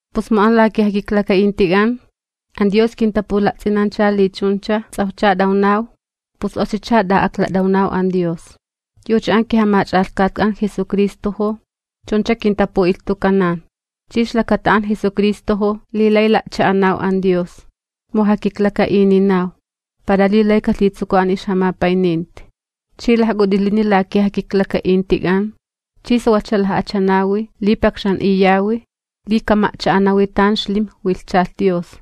Pus mu an la kijakiklaka'intik'an an Dios kintapula'ts'inancha li chuncha ts'awjcha t'awnaw, pus oxicha t'a'aklat'awnaw an Dios. Yucha an kiJamach'alhkatk'an Jesucristojo chuncha kintapu'ilhtukanan. Chi ixlakata an Jesucristojo li lay la'cha'anaw an Dios, mu jakiklaka'ininaw, para li lay kalhitsukuw an ixjamapayninti. Chi lajk'ut'ilini la kijakiklaka'intik'an chi sawalhcha laj'achanawi li pakxan'iyawi li kama'cha'anawi tan xlimj wilhchalh Dios.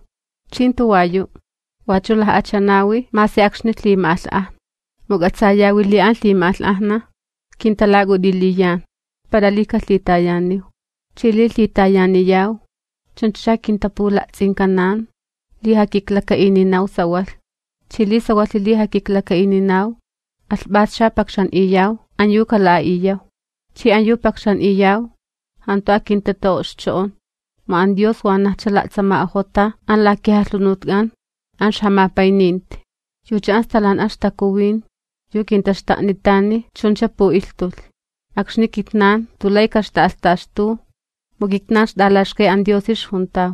Chi jantu wayu', wachu laj'achanawi masi akxni lhima'alh'ajna. Mu k'atsayawi li an lhima'alh'ajna kintalak'ut'iliyan para li kalhitayaniw. Chi li lhitayaniyaw, chunchacha kintapula'ts'inkanan li jakiklaka'ininaw sawalh. Chi li sawalhi li jakiklaka'ininaw, alhp'ascha pakxan'iyaw an yu kala'a'iyaw. Chi an yu pakxan'iyaw jantu akintita'o'xcho'on, mu an Dios wanajcha la'tsama'ojota an la kijalhunutk'an an ixjamapayninti, yucha an Stalan'a ixTakuwin yu kintaxta'nitani chuncha pu'ilhtulh. Akxni kitnan jantu lay kaxta'alhtaxtu, mu kitnan ixt'alaxkay an Diosi ixjuntaw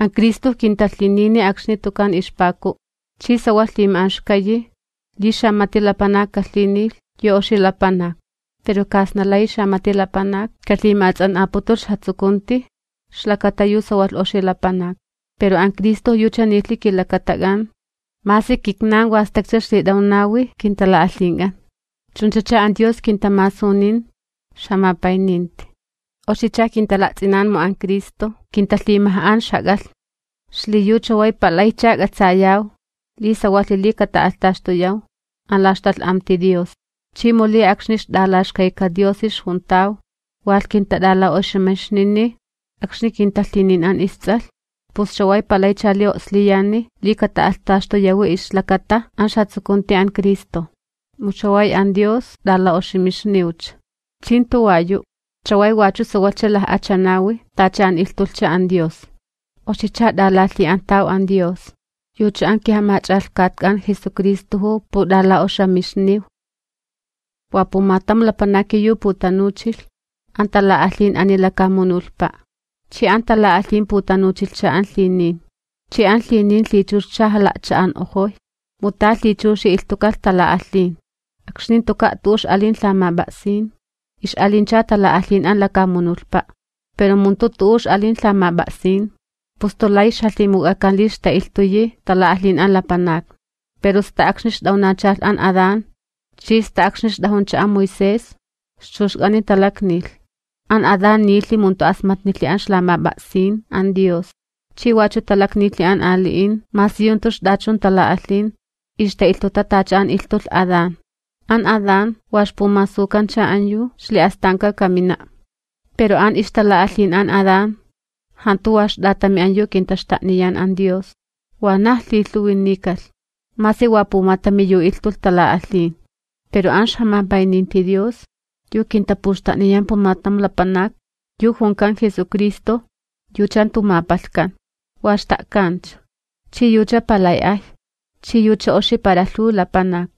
an Cristo kintalhinini akxni tukan ixpaku'. Chi sawalh lhima'anxkayi li xamati lapanak kalhinilh yu oxi lapanak. Pero kasna layi xamati lapanak kalhima'ats'an'aputulh ixjatsukunti ixlakata yu sawalh oxi lapanak. Pero an Cristo yucha nilhi kilakatak'an masi kitnan wa stakcha ixlit'awnawi kintala'alhink'an. Chunchacha an Dios kintamasunin ixjamapayninti. Oxicha kintala'ts'inan mu an Cristo kintalhimaj'an ixjak'alhni, xliyu chaway palaycha k'atsayaw li sawalhi li kata'alhtaxtuyaw an la ixtalh'amti Dios. Chi mu li akxni ixt'alaxkayka Diosi ixjuntaw walh kintat'ala'oxamixnini akxni kintalhinin an isTs'alh, pus chaway palaycha li o'sliyani li kata'alhtaxtuyawi ixlakata an ixjatsukunti an Cristo, mu chaway an Dios t'ala'oxamixniwcha. Chi jantu wayu', chaway wachu sawalhcha laj'achanawi tacha an ilhtulhcha an Dios. Oxicha t'alalhi'antaw an Dios, yucha an kiJamach'alhkatk'an Jesucristojo put'ala'oxamixniw. Wa pumatam lapanaki yu putanuchilh an tala'alhin ani lakamunulhpa', chi an tala'alhin putanuchilhcha an lhinin, chi an lhinin lhichuxcha jala'cha'an'ojoy, mu ta lhichuxi ilhtukalh tala'alhin. Akxni jantuka' tu'u ix'alin lhamap'a'sin, ix'alincha tala'alhin an lakamunulhpa'. Pero mu jantu tu'u ix'alin lhamap'a'sin, pus jantu layi ixjalhimuk'akan li ixta'ilhtuyi tala'alhin an lapanakni. Pero sta akxni ixt'awnachalh an Adán, chi sta akxni ixt'ajuncha an Moisés ixchuxk'ani talaknilh. An Adán nilhi mu jantu asmatnilhi an ixlamap'a'sin an Dios. Chi wachu talaknilhi an ali'in masi yu jantu ixt'achun tala'alhin ixta'ilhtuta tacha an ilhtulh Adán. An Adán wa ixpumasukancha an yu ixli'astanka kamina'. Pero an ixtala'alhin an Adán jantu wa ixt'atami an yu kintaxta'niyan an Dios. Wanaj lhilhuwi nikalh masi wa pumatami yu ilhtulh tala'alhin, pero an ixjamapayninti Dios yu kintapuxta'niyan pumatam lapanak, yu junkan Jesucristo, yucha jantu mapalhkan, wa xta'kancha, chi yucha palay ay, chi yucha oxi para lhuw lapanak.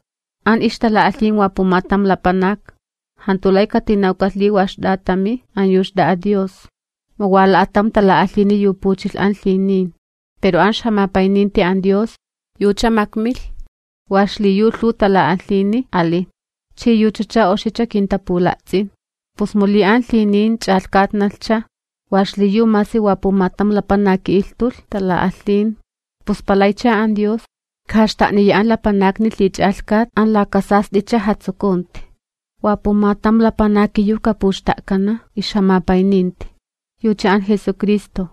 An ixtala'alhin wa pumatam lapanak, jantu lay katinawkalh li wa ixt'atami an yu xt'a'a Dios, mu wa la'atam tala'alhini yu puchilh an lhinin, pero an ixjamapayninti an Dios yucha makmilh wa xliyu lhuw tala'alhini alin, chi yuchacha oxicha kintapula'ts'in. Pus mu li an lhinin ch'alhkatnalhcha wa xliyu masi wa pumatam lapanaki ilhtulh tala'alhin, pus palaycha an Dios kajaxta'niya an lapanakni lhich'alhkat an laka sast'icha jatsukunti. Wa pumatam lapanaki yu kapuxta'kana ixjamapayninti, yucha an Jesucristo,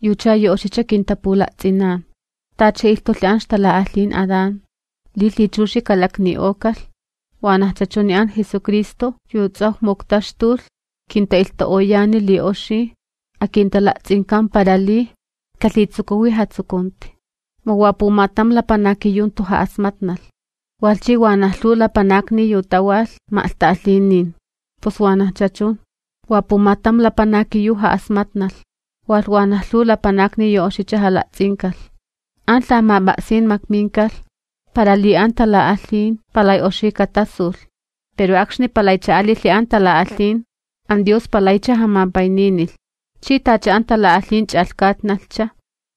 yucha yu oxicha kintapula'ts'inan. Tacha ilhtulhi an ixtala'alhin Adán li lhichuxi kalakni'okalh, wanajcha chuni an Jesucristo yu ts'awj muktaxtulh, kinta'ilhtu'oyani li oxi akintala'ts'inkan para li kalhitsukuwi jatsukunti. Mu wa pumatam lapanaki yu jantu ja'asmatnalh, walh chi wanaj lhuw lapanakni yu tawalh ma'lhta'alhinin. Pus wanajcha chun, wa pumatam lapanaki yu ja'asmatnalh, walh wanaj lhuw lapanakni yu oxicha jala'ts'inkalh. An lhamap'a'sin makminkalh para li an tala'alhin palay oxi katasulh. Pero akxni palaycha alilhi an tala'alhin, an Dios palaycha jamapayninilh. Chi tacha an tala'alhin ch'alhkatnalhcha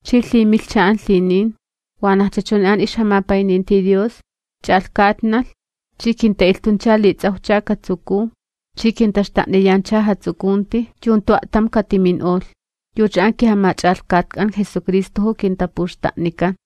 chi lhimilhcha an lhinin, wanajcha chuni an ixjamapayninti Dios ch'alhkatnalh. Chi kinta'ilhtuncha li ts'awjcha katsukuw chi kintaxta'niyancha jatsukunti yu jantu a'tam katimin'olh. Yucha an kiJamach'alhkatk'an Jesucristojo kintapuxta'nikan.